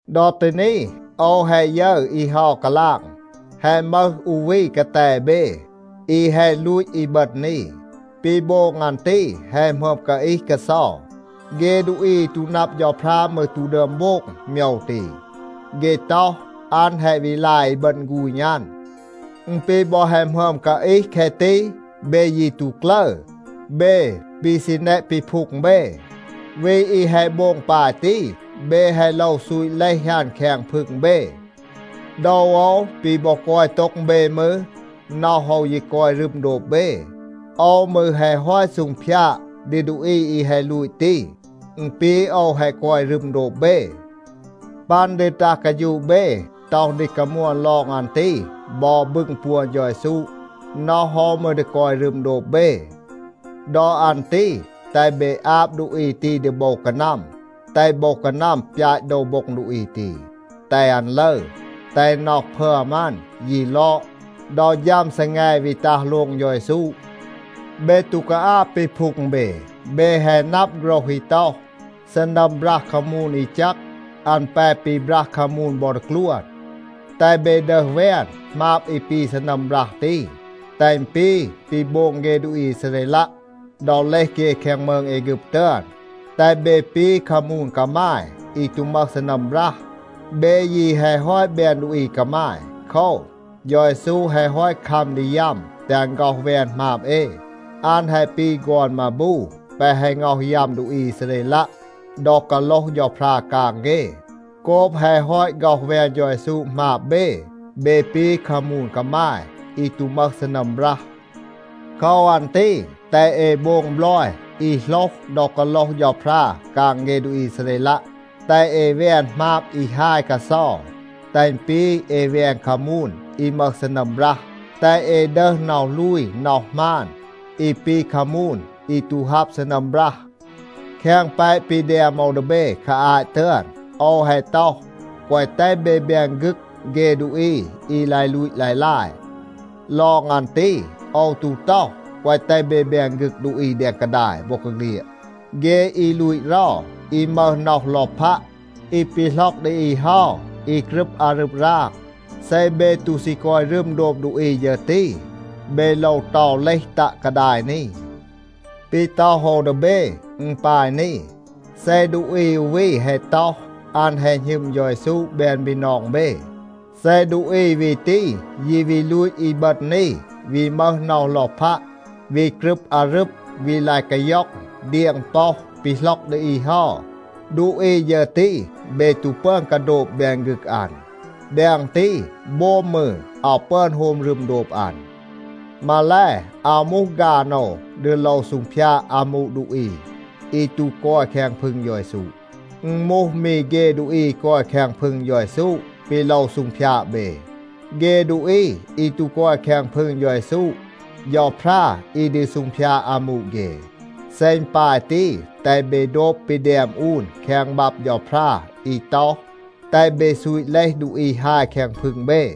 ดอ ตี นี, โอว แฮะ ยึร อี เฮา กาลาง, แฮะ มึห อู วี กาแต เบ, อี แฮะ ลูต อีบึณ อี. ปี โบง อัน ตี แฮะ หมึอม กาอีห กาเซา. เฆ ดูอี อี ตู นับ เฌาพรา มืร ตู ดึอม โบง โมยว ตี. เฆ ต็อห, อัน แฮะ วี ลาย อีบึณ ฆูณ อัน. อึณ ปี บอ แฮะ หมึอม กาอีห แคะ ตี, เบ ยี ตู กลึร, เบ ปี ซี แนะ ปีพูง เบ. วี อี แฮะ โบง ปาย ตี, เบ แฮะ โลว ซูต เลห อัน แคง พึง เบ. โดว โอว ปี บอ กอย โต็ง เบ มืร, น็อห โอว ยี กอย รึม โดบ เบ. โอว มืร แฮะ ฮอต ซูงพยาด ดี ดูอี อี แฮะ ลูต ตี. อึณ ปี โอว แฮะ กอย รึม โดบ เบ. ปัน ดี ตัห กาฌูะ เบ, ต็อห ดี กามวน ลอง อัน ตี บอ บึง ปวน เฌา เยซู, น็อห โอว มืร ดี กอย รึม โดบ เบ. ดอ อัน ตี แตห เบ อาบ ดูอี ตี ดี โบว กานัม, แตห โบว กานัม ปยาต โดว โบ็ง ดูอี ตี, แตห อัน ลึร, แตห น็อห พึอม อัน ยี ลอด ดอ ฌัม ซีแง วี ตัห โลง เฌา เยซู. เบ ตู กาอาบ ปีพูง เบ. เบ แฮะ นับ โฆรห อี ต็อห, “ซีนัม บรัห คามูน อี แจก, อัน แป ปีบรัห คามูน บอ ดีกลวน.” แตห เบ ดึห แวน หมาบ อี ปี ซีนัม บรัห ตี, แตห อึณ ปี ปี โบง เฆ ดูอี อีซาเรลัะ ดอ เลห เฆ แคง มืง แอฆึบ ตึอน. แตห เบ ปี คามูน กามาย อี ตู มึห ซีนัม บรัห. เบ ยี แฮะ ฮอต แบน ดูอี กามาย. โคว, เฌา เยซู แฮะ ฮอต คัม ดี ยัม แตห อัน ฆ็อห แวน หมาบ เอ. อัน แฮะ ปี ฆอน มาบู แปะ แฮะ ง็อห ยัม ดูอี อีซาเรลัะ ดอ กาโลห เฌาพรา กาง เฆ. โกบ แฮะ ฮอต ฆ็อห แวน เฌา เยซู หมาบ เบ, เบ ปี คามูน กามาย อี ตู มึห ซีนัม บรัห. โคว อัน ตี แตห เอ โบง บลอย อี โหลห ดอ กาโลห เฌาพรา กาง เฆ ดูอี อีซาเรลัะ. แตห เอ แวน หมาบ อี ฮาย กาเซา, แตห อึณ ปี เอ แวน คามูน อี มึห ซีนัม บรัห. แตห เอ ดึห น็อห ลูย น็อห หมาน อี ปี คามูน อี ตู ฮับ ซีนัม บรัห. แคง แปะ ปี แดม โอว ดี เบ คา อาต ตึอน, โอว แฮะ ต็อห, แกวะ แตห เบ แบน ฆึก เฆ ดูอี อี ลาย ลูต ลาย ลาย. ลอง อัน ตี, โอว ตู ต็อห, แกวะ แตห เบ แบน ฆึก ดูอี แดง กาดาย บอกาเฆลียด, เฆ อี ลูต เรา, อี มึห น็อห ลอพัะ, อี ปีหล็อก ดี อี เฮา, อี กรึบ อารึบ ราง. เซ เบ ตู ซี กอย รึม โดบ ดูอี ฌึร ตี, เบ โลว เตา เลห ตัะ กาดาย นี. ปี ต็อห โอว ดี เบ, อึณ ปาย นี. เซ ดูอี อู วี แฮะ ต็อห, อัน แฮะ หณึม เฌา เยซู แบน บีนอง เบ, เซ ดูอี วี ตี ยี วี ลูต อีบึณ อี, วี มึห น็อห ลอพัะ, วี กรึบ อารึบ, วี ลาย กาย็อง, เดียง ป็อห, ปีหล็อก ดี อี เฮา, ดูอี ฌึร ตี เบ ตู ปึอน กาโดบ แบน ฆึก อัน. แดง ตี, โบม มืร อาว ปึอน โฮม รึม โดบ อัน. มาแล, อาว มูห ฆาน โอว ดี โลว ซูงพยาด อามู ดูอี อี ตู กอย แคง พึง เฌา เยซู. อึณ มูห มี เฆ ดูอี อี กอย แคง พึง เฌา เยซู, ปี โลว ซูงพยาด เบ. เฆ ดูอี อี ตู กอย แคง พึง เฌา เยซู, เฌาพรา อี ดี ซูงพยาด อามู เฆ. เซ อึณ ปาย ตี, แตห เบ โดบ ปี แดม อูน แคง บับ เฌาพรา อี ต็อห, “แตห เบ ซูต เลห ดูอี ฮาย แคง พึง เบ.”